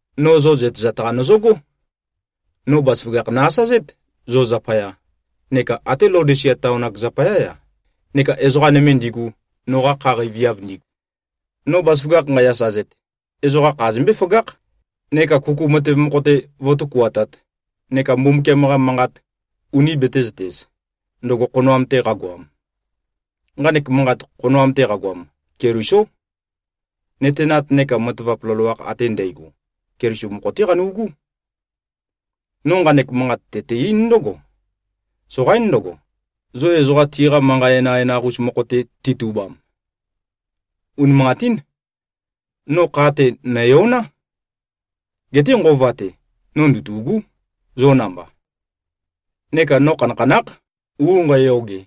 No zo zøtezat-qa nøzøgó. No bazaføgakh nø-asazét, zo zapaya, neka até Laodisia taon-ak zapayá-ya, neka ezoqa nøme ndigu, noqa kha qeiviav ndigu. No bazaføgakh nqæ-asazet, ezoqa kha zømbé-føgákh, neka kuku matev mokho-te vǿtøkuatāt neka Mbumbukiam-qa manqat uni betēzøtez, ndøgo khonoam-te qagoam. Nqanek manqat, khonoam-te qagoam, Kelisó. Nøtenat neka matavap loloakh ate ndægo, Keliso mokho-té qanu꞉gú. No nqanek manqat tøte-eín ndǿgo: Soqaín ndøgo, zo ezoqa tiqa manqa enøenaq-us mokho-te titubam. Unimanqatín. No kha-te, nø̀yoná. Geté nqova-te, no ndøtû꞉gú, zo namba. Neka no khanakhanákh, u nqæyoge,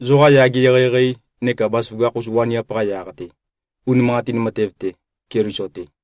zoqa yage eqeieqei neka bazaføgakh-us waniap-qa yaq-te, unimanqatin matev-te, Keliso-te.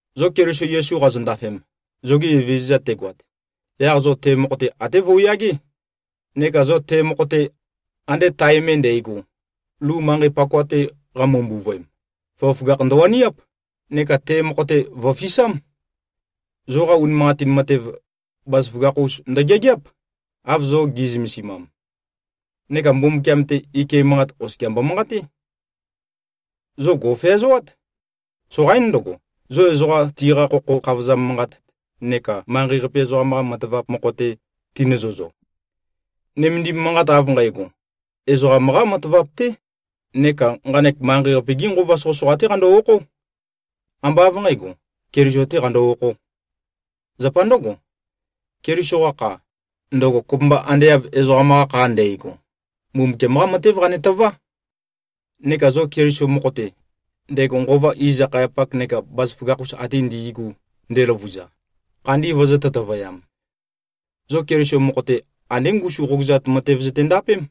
Zo Keliso Yesu qazondafem, zoge Evezøza tegoat, yaq zo te mokho-te até vøuyagé. Neka zo te mokho-te, ande tae me ndægo, lu manqei pakoa-te qamø-mbuvøem, føgøføgakh ndøwaniáp, neka te mokho-te vø̀fisám. Zoqa unimanqatin matev, bazaføgakh-us ndøgeageáp, av zo gi꞉zømesimam. Neka Mbumbukiam-te, ike manqat oskia mbomanqaté. Zo gò꞉feazoát. Soqaín ndøgo, zo ezoqa tiqa khokho khavozam manqat neka manqei-qape ezoqam-qa matavap mokho-te tinøzøzo. Nømendim manqat av nqægo, ezoqam-qá matavap-té neka nqanek manqei-qape-gí nqova soqøsoqa-té qando-okhó. Ambá av nqǣgo, Keliso-tē qando-okhō. Zapa ndǿgo, Keliso-qa kha, ndøgo kopømba ande av ezoqam-qa kha ndægo, Mbumbukiam-qá matév qanetøvá. Neka zo Keliso mokho-te, ndego nqova iz-akhayapak neka bazaføgakh-us ate ndi꞉gu ndeløvuza, khandi vøzø̄-tøtøvøyam. Zo Keliso mokho-te, andé ngusum qogøzat matev zøtendapém.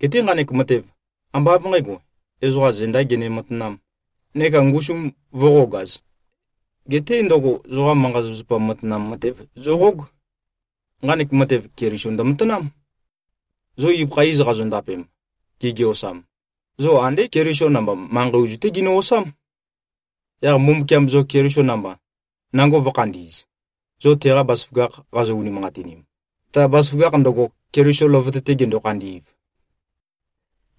Geté nqanek matev, ambá av nqǣgo, ezoqa zendā gene-matanām, neka ngusum vø̄qogaz. Geté ndøgo zoqa manqa-zapazapa matanam matev zøqóg. Nqanek matev, Keliso ndømatanám. Zo ibøkha iz qazondapem, gigiosam, zo andé Keliso namba, manqei ozu-té ginø-osám. Yaq Mbumbukiam zo Keliso namba, nango vø̄khandi꞉z, zo teqa bazaføgakh qazo-unimanqatinim, ta bazaføgakh ndøgo, Keliso løvøte-te gendo-khandi꞉v.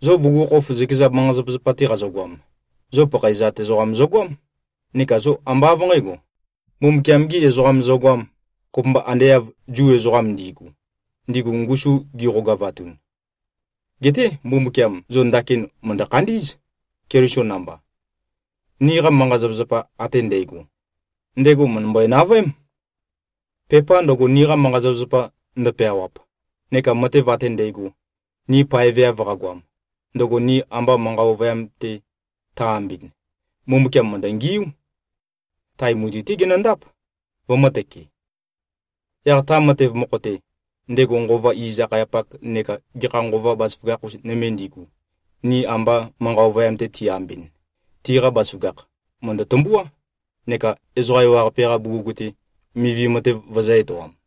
Zo bugukhokhof zøkeza manqa-zapazapa-te qazogoam, zo pakhaezat ezoqa zogoám, neka zo ambá av nqǣgo, Mbumbukiam-gī ezoqam zogoām, kopømba ande av Zu ezoqam ndi꞉gu, ndigu ngusu gizø-qogavatun. Geté Mbumbukiam zo ndakin mø̀ndø-khandí꞉z, Keliso namba. Niqa manqa-zapazapa ate ndægo, ndego mø̀ndømbøe-navøém. Pepa ndøgo, niqa manqa-zapazapa ndo꞉peawap neka matev ate ndægo, ni paeveav qagoam, ndøgo ni amba manqa ovøyam-te tø-ambɨn, Mbumbukiam mø̀ndøngiú. Tae mutui-té genøndáp, vømø̄tøke. Yaq ta matev mokho-te, ndego nqova iz-akhayapak neka gekha nqova bazaføgakh-us nøme ndigu, ni amba manqa ovøyam-te ti-ambɨn, tiqa bazaføgakh mø̀ndø-tømbuá neka ezoqa ewaqape-qa bugug-te, mivi matev vøzø̄-etoam.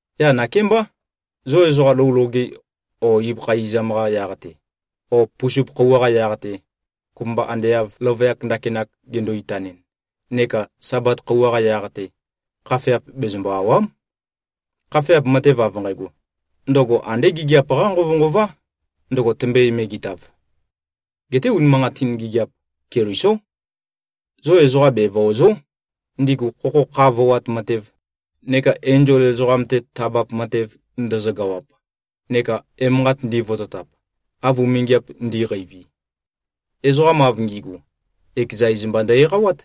Yaq nakémbá, zo ezoqa lou loge o ibøkha izam-qa yaq-te o pusup khøuwa-qa yaq-te, kopømba ande av løvøyak ndakinak gendo-itanɨn neka Sabat khøuwa-qa yaq-te, khafeap bezømbø-àwa᷄m. Khafeap matev av nqægo, ndøgo andé gigiap-qá nqovønqová, ndøgo tømbøe-megetav. Geté unimanqatin gigiap, Kelisó. Zo ezoqa bevøòzo᷄, ndigu khokho kha voat matev neka enzol ezoqam-te tabap matev ndøzøgawap neka emanqat ndivototap, av umingiap ndi꞉qeivi. Ezoqa av ngi꞉gu, ekeza iz mba ndø-eqawát.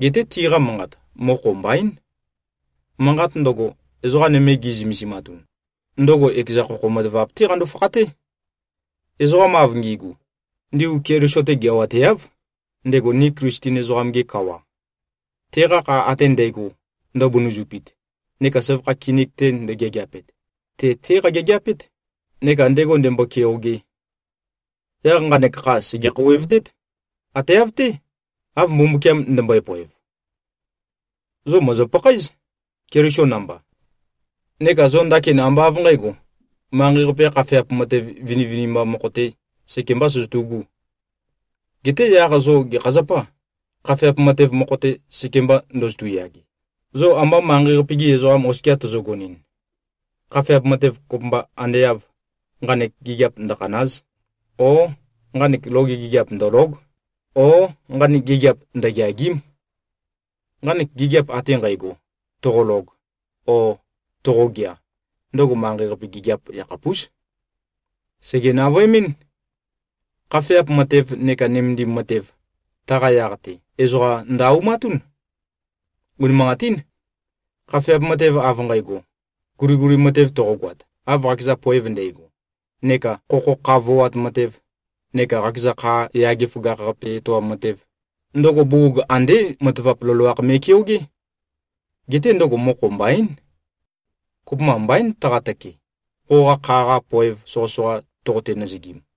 Geté tiqa manqat, mokho mbaín. Manqat ndøgo, ezoqa nøme gi꞉zømesimatun, ndøgo ekeza khokho matavap-té qando-fakhaté. Ezoqa av ngi꞉gu, ndigu Keliso-te geawateáv, ndego ni Klisten ezoqam-ge kawa. Teqa kha ate ndægo, ndøbunuzupit neka søvakha kinik ndægeageapet, te-té qageageapét, neka ndego ndēmbō-kēōgē. Yaq nqanek kha sège-khouwevtét. Ate av-té, av Mbumbukiam ndømbøe-poev. Zo mòzo-pakhaéz, Keliso namba. Neka zo ndakin ambá av nqǣgo, manqei-qape-qa khafeap matev vinivinimba mokho-te sekembā søzøtu꞉gū. Geté yaq zo gekha zapâ, khafeap matev mokho-te sekemba ndozotu꞉-yage, zo amba manqei-qape-gi ezoqam oskia tozogonɨn, khafeap matev kopømba ande av, “Nqanek gigiap ndøkhàna᷄z!” o “Nqanek loge gigiap ndòlo᷄g!” o “Nqanek gigiap ndøgeàgi᷄m!”? Nqanek gigiap ate nqægo, toqolog o toqogea, ndøgo manqei-qape gigiap yakhapús. Sège-navøemɨ́n. Khafeap matev neka nømendim matev, taqa yaq-te, ezoqa ndø-aumatún. Unimanqatín. Khafeap matev av nqægo, guliguli matev toqogoat, av qakeza poev ndægo, neka khokho kha voat matev, neka qakeza kha yage føgakh-qape etoam matev, ndøgo bugug andé matavap loloakh me꞉keogé. Geté ndøgo mokho mbaín. Kopømba mbaín, taqatøke, qoqa kha-qa poev soqøsoqa toqote-nøzøgim.